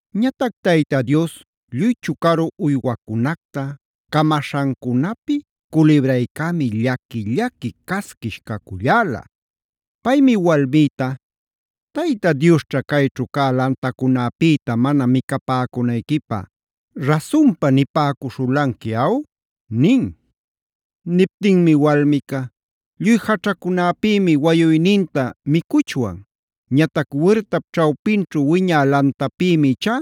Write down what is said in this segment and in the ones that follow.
Ñatac Tayta Dios lluy chucaru uywacunacta camaśhancunapi culibraycämia llaqui-llaqui casquish caculläla. Paymi walmïta: “¿Tayta Diosćha cayćhu cä lantacunäpïta mana micapäcunayquipä rasunpa nipäcuśhulanqui, aw?” nin. Niptinmi walmica: “Lluy jaćhacunäpïmi wayuyninta micuchwan. Ñatac wirtap ćhawpinćhu wiñä lantapïmi ichá: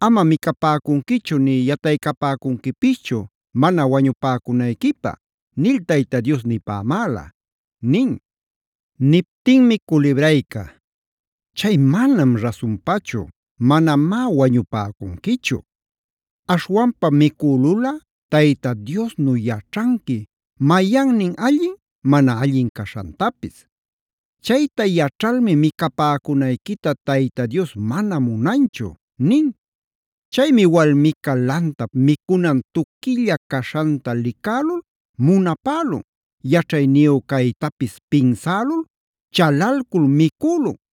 ‘ama micapäcunquichu nï yataycapäcunquipischu, mana wañupäcunayquipä’ nil Tayta Dios nipämäla” nin. Niptinmi culibrayca: “¡Chay manam rasunpachu; manamá wañupäcunquichu! Aśhwanpam micülulꞌa Tayta Diosnu yaćhanqui mayannin allin mana allin caśhantapis. Chayta yaćhalmi micapäcunayquita Tayta Dios mana munanchu” nin. Chaymi walmica lantap micunan tuquilla caśhanta licälul munapälun, yaćhayniyu caytapis pinsälul chalalcul micülun.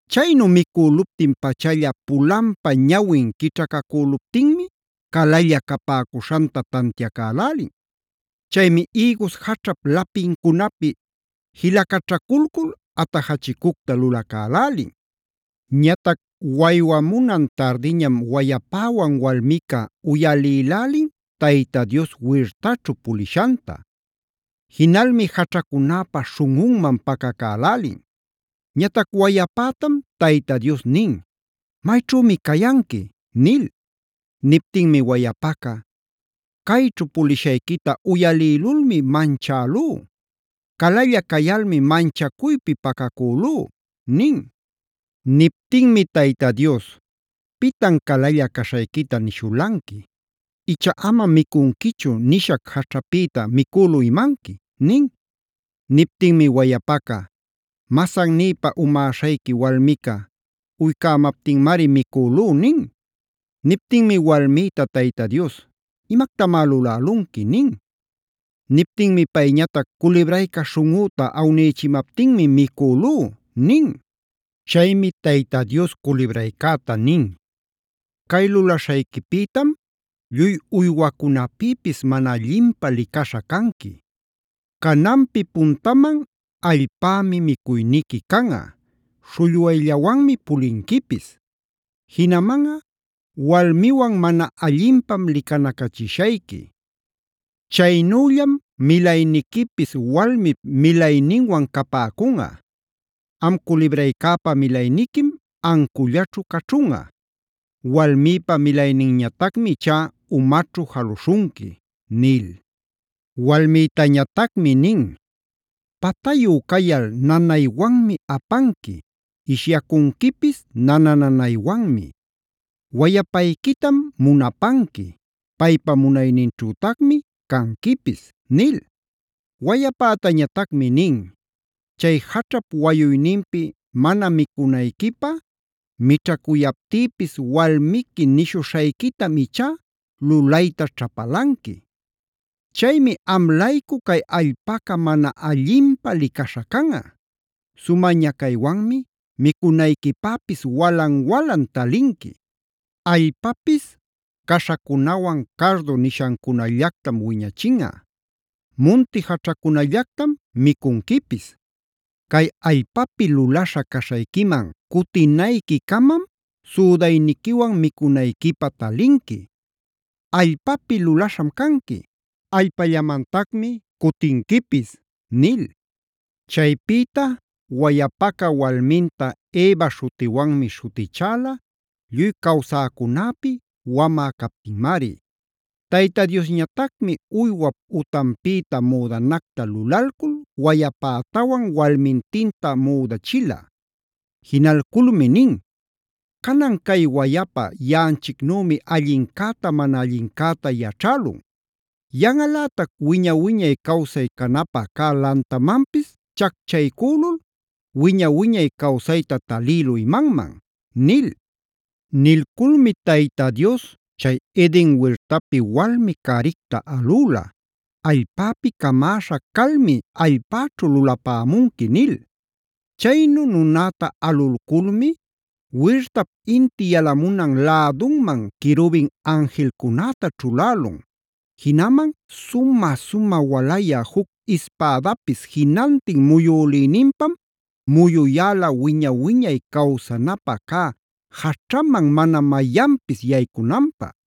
Chaynu micüluptin-pachalla pulanpa ñawin quićhacacüluptinmi calalla capäcuśhanta tantiacälälin. Chaymi ïgus jaćhap lapincunapi jilacaćhaculcul atajachicucta lulacälälin. Ñatac waywamunan tardiñam wayapäwan walmica uyalïlälin Tayta Dios wirtaćhu pulishanta. Jinalmi jaćhacunäpa śhunꞌunman pacacälälin. Ñatac wayapätam Tayta Dios nin: “¿Mayćhümi cayanqui?” nil. Niptinmi wayapaca: “Cayćhu pulishayquita uyalïlulmi manchälú. Calalla cayalmi manchacuypi pacacülú” nin. Niptinmi Tayta Dios: “¿Pitan calalla caśhayquita nishulanqui? ¿Icha ‘amam micunquichu’ nishac jaćhapïta micülu imanqui?” nin. Niptinmi wayapaca: “Masannïpä umäśhayqui walmica uycämaptinmari micülú” nin. Niptinmi walmïta Tayta Dios: “Imactamá lulälunqui” nin. Niptinmi payñatac: “Culibrayca śhunꞌüta awnïchimaptinmi micülú” nin. Chaymi Tayta Dios culibraycäta nin: “Cay lulaśhayquipïtam, lluy uywacunäpïpis mana allinpä licaśha canqui. Cananpi puntaman allpämi micuyniqui canꞌa, śhullwayllawanmi pulinquipis. Jinamanꞌa walmiwan mana allinpam licanacachishayqui. Chaynüllam milayniquipis walmip milayninwan capäcunꞌa. Am culibraycäpa milayniquim ancullaćhu caćhunꞌa; walmïpa milayninñatacmi ichá umaćhu jaluśhunqui” nil. Walmïtañatacmi nin: “Patayu cayal nanaywanmi apanqui; ishyacunquipis nana-nanaywanmi. Wayapayquitam munapanqui; paypa munayninćhütacmi canquipis” nil. Wayapätañatacmi nin: “Chay jaćhap wayuyninpi mana micunayquipä mićhacuyaptïpis, walmiqui nishuśhayquitam ichá lulayta ćhapalanqui. Chaymi am-laycu cay allpaca mana allinpä licaśha canꞌa. Sumä ñacaywanmi micunayquipäpis walan-walan talinqui. Allpapis caśhacunawan cardo nishancunallactam wiñachinꞌa;c munti jaćhacunallactam micunquipis. Cay allpapi lulaśha caśhayquiman cutinayquicamam südayniquiwan micunayquipä talinqui. Allpapi lulaśham canqui; allpallamantacmi cutinquipis” nil. Chaypïta wayapaca walminta “Eva” śhutiwanmi śhutichäla, lluy cawsäcunäpi wamä captinmari. Tayta Diosñatacmi uywap utanpïta müdanacta lulalcul wayapätawan walmintinta müdachila. Jinalculmi nin: “Canan cay wayapa yaꞌanchicnümi allincäta mana allincäta yaćhälun; yanꞌalätac wiña-wiñay cawsay canapä cä lantamanpis chacchaycülul, wiña-wiñay cawsayta talïlu imanman”d nil. Nilculmi Tayta Dios chay Eden wirtapi walmi-caricta alüla: “Allpäpi camäśha calmi allpäćhu lulapämunqui” nil. Chaynu nunäta alulculmi wirtap inti yalamunan lädunman querubin anjilcunäta ćhulälun. Jinaman sumä-sumä walayä juc ispädapis jinantin muyülïninpam muyuyäla wiña-wiñay cawsanapä cä jaćhaman mana mayanpis yaycunanpä.